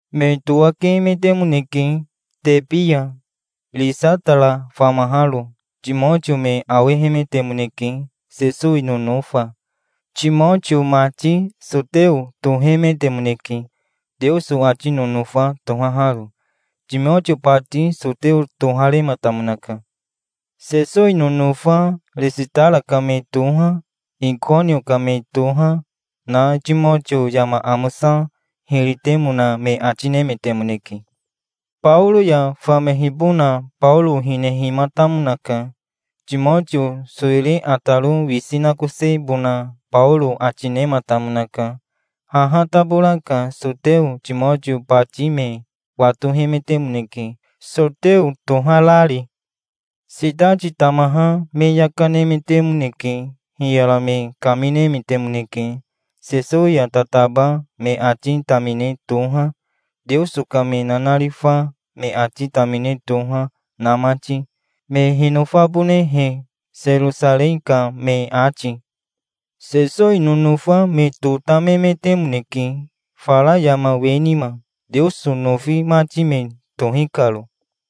Me towakemetemoneke Tebi ya, Ristara famaharo. Timotio me awehemetemoneke, Sesowi nonofa. Timotio mati soteo tohemetemoneke, Teoso ati nonofa tohaharo. Timotio bati soteo toharematamonaka. Sesowi nonofa Ristara ka me toha, Ikonio ka me toha, na Timotio yama amosa hiri temona me ati nemetemoneke. Baoro ya famehibona Baoro hinehimatamonaka. Timotio sowiri ataro wisi nakosebona Baoro ati nematamonaka. Haha tabora ka soteo Timotio bati me watohemetemoneke, soteo toharari. Sitati tamaha me yaka nemetemoneke. Hiyara me kaminemetemoneke, Sesowi ya tataba me ati tamine toha, Teoso ka me nanarifa me ati tamine toha, na mati, me hinofabonehe, Serosarei ka me ati. Sesowi nonofa me totamemetemoneke, fara yama we nima, Teoso nofi mati me tohi karo.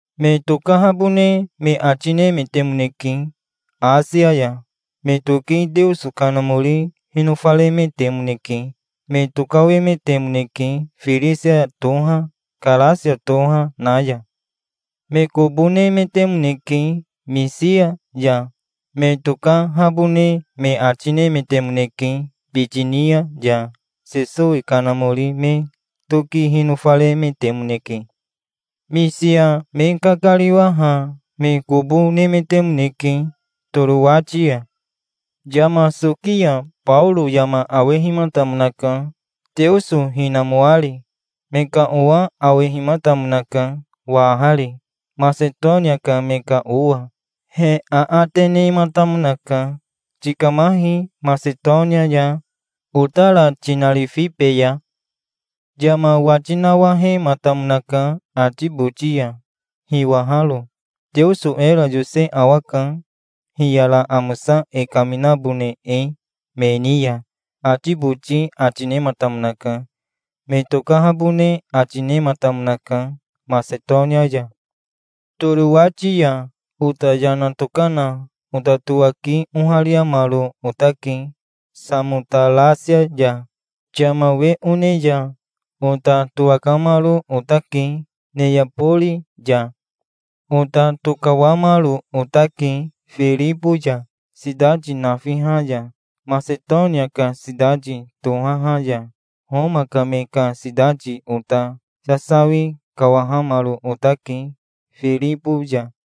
Me tokahabone me ati nemetemoneke Asia ya. Me toki Teoso Kanamori hinofaremetemoneke. Me tokawemetemoneke Firisia toha, Karasia toha, na ya. Me kobo nemetemoneke Misia ya. Me tokahabone me ati nemetemoneke Bitinia ya. Sesowi Kanamori me toki hinofaremetemoneke. Misia me kakariwaha me kobo nemetemoneke Torowati ya. Yama soki ya Baoro yama awehimatamonaka, Teoso hinamoari. Me ka owa awehimatamonaka wahari, Masetonia ka me ka owa. He aate nematamonaka. "Tikamahi Masetonia ya, otara tinarifibeya". Yama wati nawahematamonaka ati boti ya, hiwaharo. "Teoso era yose awaka, hiyara amosa e kaminabone e me ni ya", ati boti ati nematamonaka. Me tokahabone ati nematamonaka Masetonia ya. Torowati ya ota yana tokana ota towaki ohariamaro otake Samotarasia ya. Yama we one ya ota towakamaro otake Neabori ya. Ota tokawamaro otake Firibo ya, sitati nafiha ya, Masetonia ka sitati tohaha ya, Homa ka me ka sitati. Ota sasawi kawahamaro otake Firibo ya.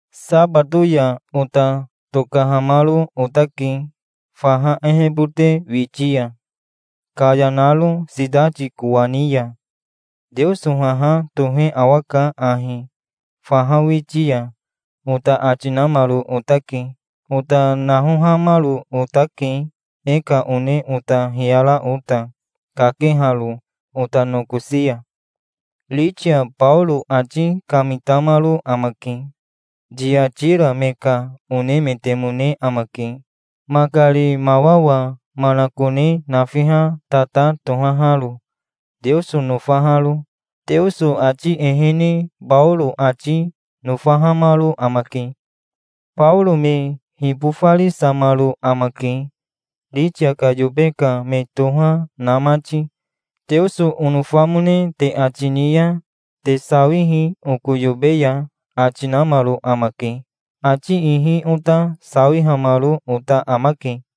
Sabato ya ota tokahamaro otake faha ehebote witi ya, kaya naro sitati kowani ya. "Teoso haha tohe awaka ahi faha witi ya", ota ati namaro otake. Ota nahohamaro otake e ka one ota hiyara ota, kakeharo ota nokosi ya. Ritia Baoro ati kamitamaro amake. Tiatira me ka onemetemone amake, makari mawawa manakone nafiha tata tohaharo, Teoso nofaharo. Teoso ati ehene Baoro ati nofahamaro amake. Baoro me hibofarisamaro amake, Ritia ka yobe ka me toha na mati. "Teoso onofamone te ati ni ya te sawihi oko yobe ya", ati namaro amake. Ati ihi ota sawihamaro ota amake.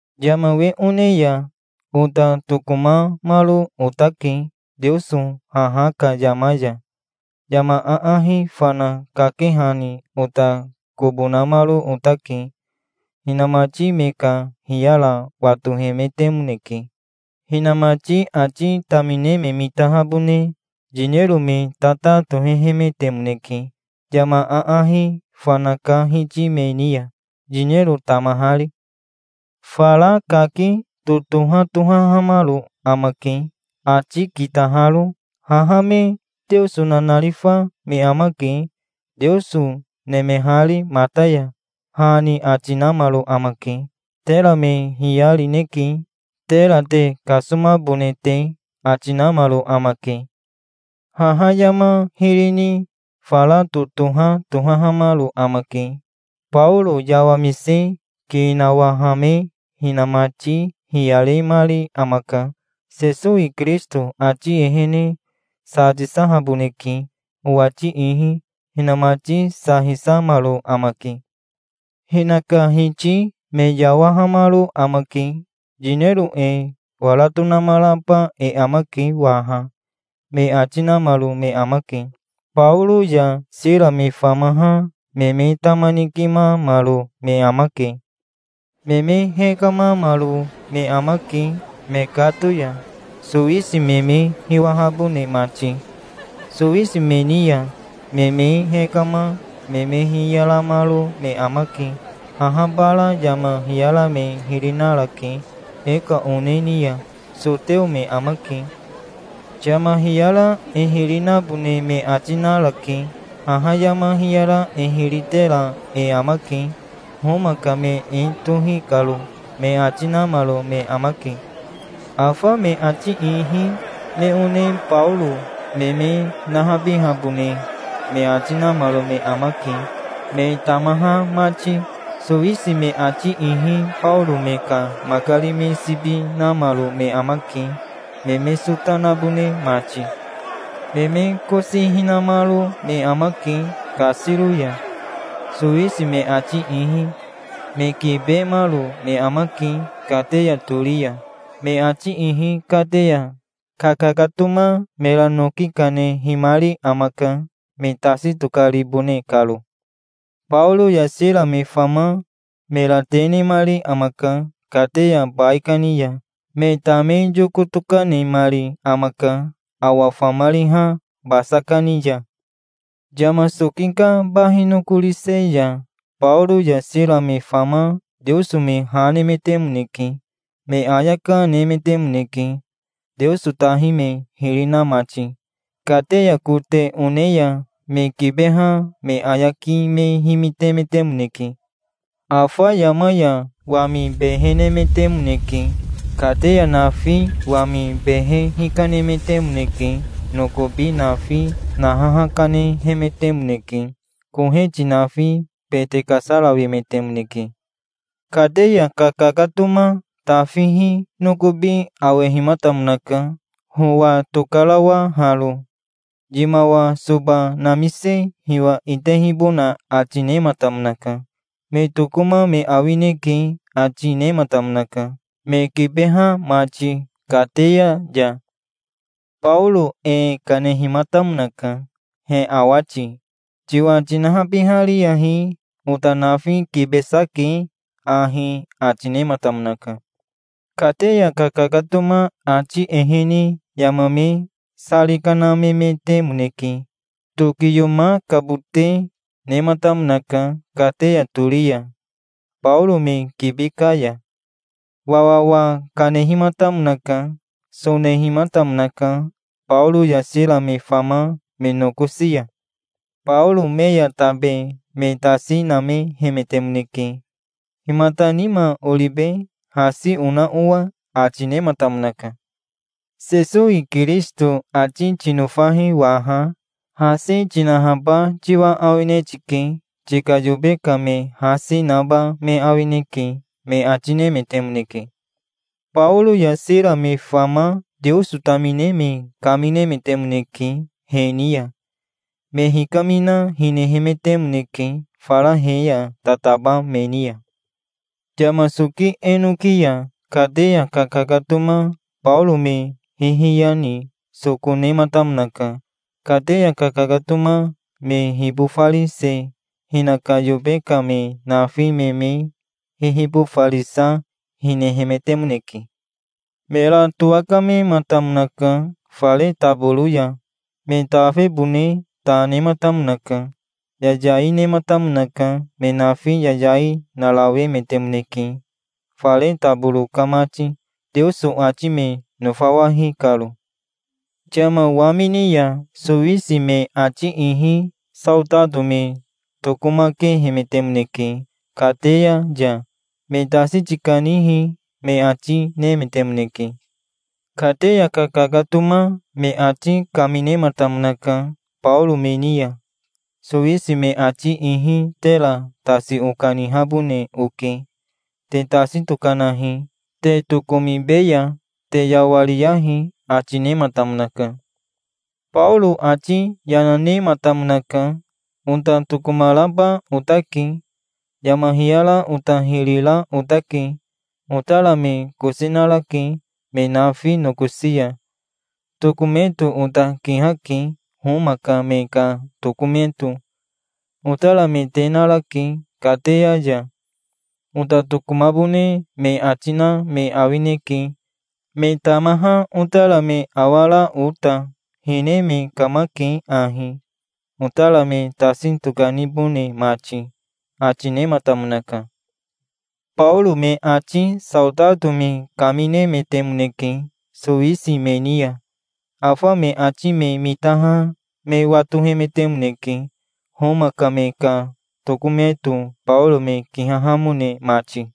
Yama we one ya ota tokomamaro otake Teoso haha ka yama ya. Yama aahi fana kakehani ota kobo namaro otake. Hinamati me ka hiyara watohemetemoneke. Hinamati ati tamine me mitahabone yinero me tata tohehemetemoneke, yama aahi fana ka hiti me ni ya, yinero tamahari. Fara kaki totoha tohahamaro amake, ati kitaharo. "Haha me Teoso nanarifa me amake, Teoso nemehari mata ya", ha ni ati namaro amake. "Tera me hiyarineke, tera te kasomabone te", ati namaro amake. Haha yama hiri ni fara totoha tohahamaro amake. Baoro yawamise ki nawahame hinamati hiyaremari amaka. "Sesowi Kirisito ati ehene sa tisahaboneke, owati ihi". Hinamati sa hisahamaro amake. Hinaka hiti me yawahamaro amake. "Yinero e wara tonamaraba e amake waha", me ati namaro me amake. Baoro ya Sira me famaha me me tama nikimamaro me amake. Me me hekamamaro me amake, mekato ya, sowisi me me hiwahabone mati. Sowisi me ni ya me me hekama me me hiyaramaro me amake. "Haha bara yama hiyara me hiri narake e ka one ni ya. Soteo me amake. Yama hiyara e hiri nabone me ati narake. Haha yama hiyara e hiri tera e amake, Homa ka me e tohi karo", me ati namaro me amake. Afa me ati ihi me one Baoro me me nahabihabone me ati namaro me amake, me tamaha mati. Sowisi me ati ihi Baoro me ka makari me sibi namaro me amake, me me sota nabone mati. Me me kosi hinamaro me amake kasiro ya, sowisi me ati ihi. Me kibemaro me amake kateya tori ya. Me ati ihi kateya kakakatoma mera noki kanehimari amaka, me tasi tokaribone karo. Baoro ya Sira me fama mera te nemari amaka kateya baikani ya. Me tame yoko tokanemari amaka awa famariha basa kani ya. Yama soki ka bahi nokorise ya Baoro ya Sira me fama Teoso me ha nemetemoneke. Me ayaka, nemetemoneke Teoso tahi me hiri na mati. Kateya kote one ya me kibeha me ayaki me himitemetemoneke. Afa yama ya wami behe nemetemoneke. Kateya nafi wami behe hikanemetemoneke. Nokobi nafi nahaha kanehemetemoneke. Koheti nafi bete kasarawemetemoneke. Kateya kakakatoma tafihi nokobi awehimatamonaka, howa tokarawaharo. Yimawa soba namise hiwa itehibona ati nematamonaka. "Me tokoma me awineke", ati nematamonaka, me kibeha mati kateya ya. Baoro e kanehimatamonaka, he awati. "Tiwa tinahabihariyahi. Ota nafi kibesa ke ahi", ati nematamonaka. Kateya kakakatoma ati ehene yama me sari kanamemetemoneke. Tokiyomakabote nematamonaka kateya tori ya, Baoro me kibi ka ya. Wawawa kanehimatamonaka. Sonehimatamonaka Baoro ya Sira me fama me nokosi ya. Baoro me ya tabe me tasi namehemetemoneke. "Himata nima oribe, hasi ona owa?" ati nematamonaka. "Sesowi Kirisito ati tinofahi waha. Hasi tinahaba tiwa awine tike. Tika yobe ka me hasi, naba me awineke", me ati nemetemoneke. Baoro ya Sira me fama Teoso tamine me kaminemetemoneke he ni ya. Me hikamina, hinehemetemoneke, fara he ya tataba me ni ya. Yama soki enoki ya kateya kakakatoma Baoro me hihiya ni soko nematamonaka. Kateya kakakatoma me hibofarise, hinaka yobe ka me nafi me me hihibofarisa, hinehemetemoneke. Mera towakamematamonaka fare taboro ya. Me tafebone ta nematamonaka. Yayai nematamonaka. Me nafi yayai narawemetemoneke, fare taboro ka mati, Teoso ati me nofawahi karo. Yama wamini ya sowisi me ati ihi saotato me tokomakehemetemoneke kateya ya. "Me tasi tikanihi", me ati nemetemoneke. Kateya kakakatoma me ati kaminematamonaka Baoro me ni ya. "Sowisi me ati ihi tera tasi okanihabone oke. Te tasi tokanahi, te tokomibeya. Te yawariyahi", ati nematamonaka. Baoro ati yana nematamonaka. "Ota tokomaraba otake. Yama hiyara ota hiri ra otake. Otara me kosi narake, me nafi nokosi ya. Tokometo ota kihake, Homa ka me ka tokometo. Otara me te narake kateya ya. Ota tokomabone me ati na me awineke, me tamaha otara me awara ota. Hine me kamake ahi, otara me tasi tokanibone mati", ati nematamonaka. Baoro me ati saotato me kaminemetemoneke sowisi me ni ya. Afa me ati me mitaha me watohemetemoneke, Homa ka me ka tokometo Baoro me kihahamone mati.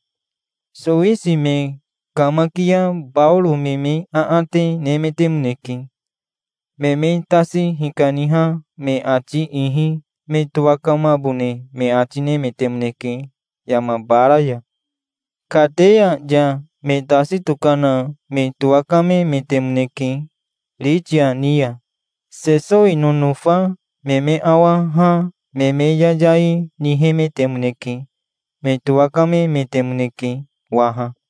Sowisi me kamakia Baoro me me aate nemetemoneke. Me me tasi hikaniha me ati ihi me towakamabone me ati nemetemoneke yama bara ya. Kateya ya me tasi tokana me towakamemetemoneke Ritia ni ya. Sesowi nonofa me me awaha me me yayai nihemetemoneke. Me towakamemetemoneke waha.